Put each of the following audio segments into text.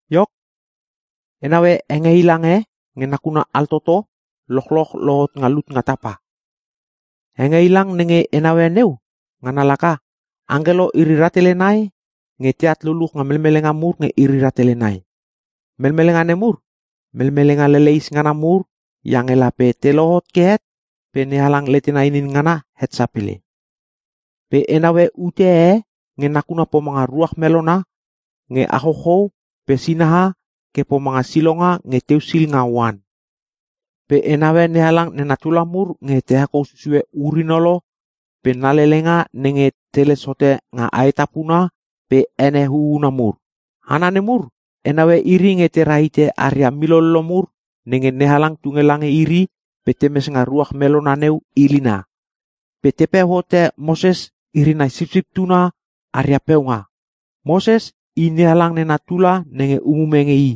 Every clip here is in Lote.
Iok, e naue hengeilang e nge nakuna altoto lochloch lohot nga lut nga tapa. Hengeilang nenge e naue neu ngana laka: Angkelo iri rahtele nai nge teat luluch nga melmelenga mur nge iri rahtele nai. Melmelenga nemur melmelenga leleis ngana mur iange lape te lohot ke het pe NeHalang letena inin ngana het sapele. Pe e naue ute e nge nakuna pomanga ruach melona nge achouchou pe sinaha ke pomanga silonga nge teusil nga oan. Pe e naue NeHalang nena tula mur nenge te hekou susue ur-inolo pe na lelenga nenge teles hote nga aetapuna pe ene huuna mur. Hana nemur e naue iri nge te rahite aria milollo mur nenge NeHalang tunge lange iri pe temes nga ruach melona neu ilina. Pe tepeu hote Moses iri nai Sipsip Tuna aria peunga. Moses i NeHalang nena tula nenge umume nge I.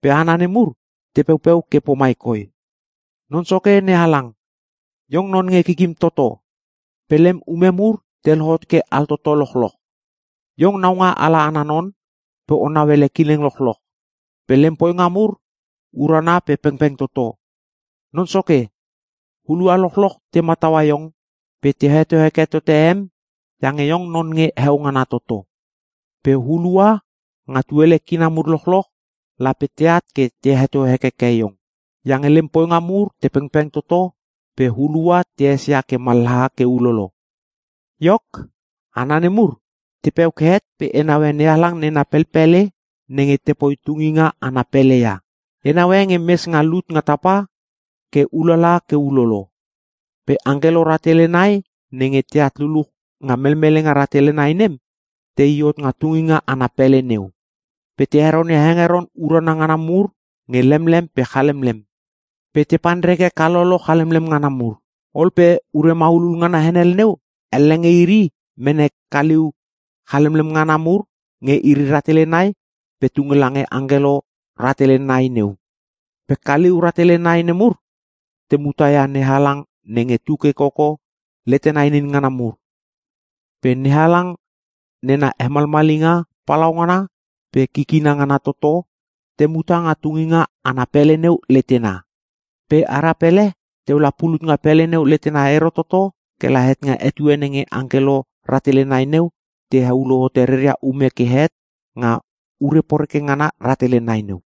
Pe hana nemur te peupeu ke pomai koi, “Non Soke NeHalang, Iong non nge Kikim Toto, pe lem ume mur te lohot ke altoto lochloch. Iong naungaala ana non pe O nauele kileng lochloch. Pe lem poinga mur urana pe pengpeng toto. Non Soke, hulua lochloch te mataua Iong pe te heto heke tote em iange Iong non nge Heo Ngana Toto. Pe hulua nga tuele kina mur lochloch, lape teat ke te heto hekeke Iong. Iange lem poinga mur te pengpeng toto pe hulua te esia ke mallaha ke ulolo.” Iok, hana nemur tepeu ke het pe e naue NeHalang nena pelpele nenge tepoi tunginga ana pele ia. E naue nge mes nga lut nga tapa pe ulala ke ulolo. Pe angkelo rahtele nai nenge teat luluch nga melmelenga rahtele nai nem tei hot nga tunginga ana pele neu. Pe te heronia hengeron urana ngana mur nge lemlem pe chalemlem. Pe te panreke kalolo chalemlem ngana mur. Ol pe ure maulul ngana henel neu elle nge iri mene kaliu chalemlem ngana mur nge iri rahtele nai pe tunge lange angkelo rahtele nai neu. Pe kaliu rahtele nai nemur te muta ia NeHalang nenge tuke koko, letena inin ngana mur. Pe NeHalang nena hemalmalinga palaungana pe kikina ngana toto, te muta nga tunginga pele neu letena. Pe ara pele teu la pulut nga pele neu letena ero toto kela het nga etue nenge angkelo rahtele nai neu te heulo hote reria ume ke tehet, nga ure poreke ngana rahtele nai neu.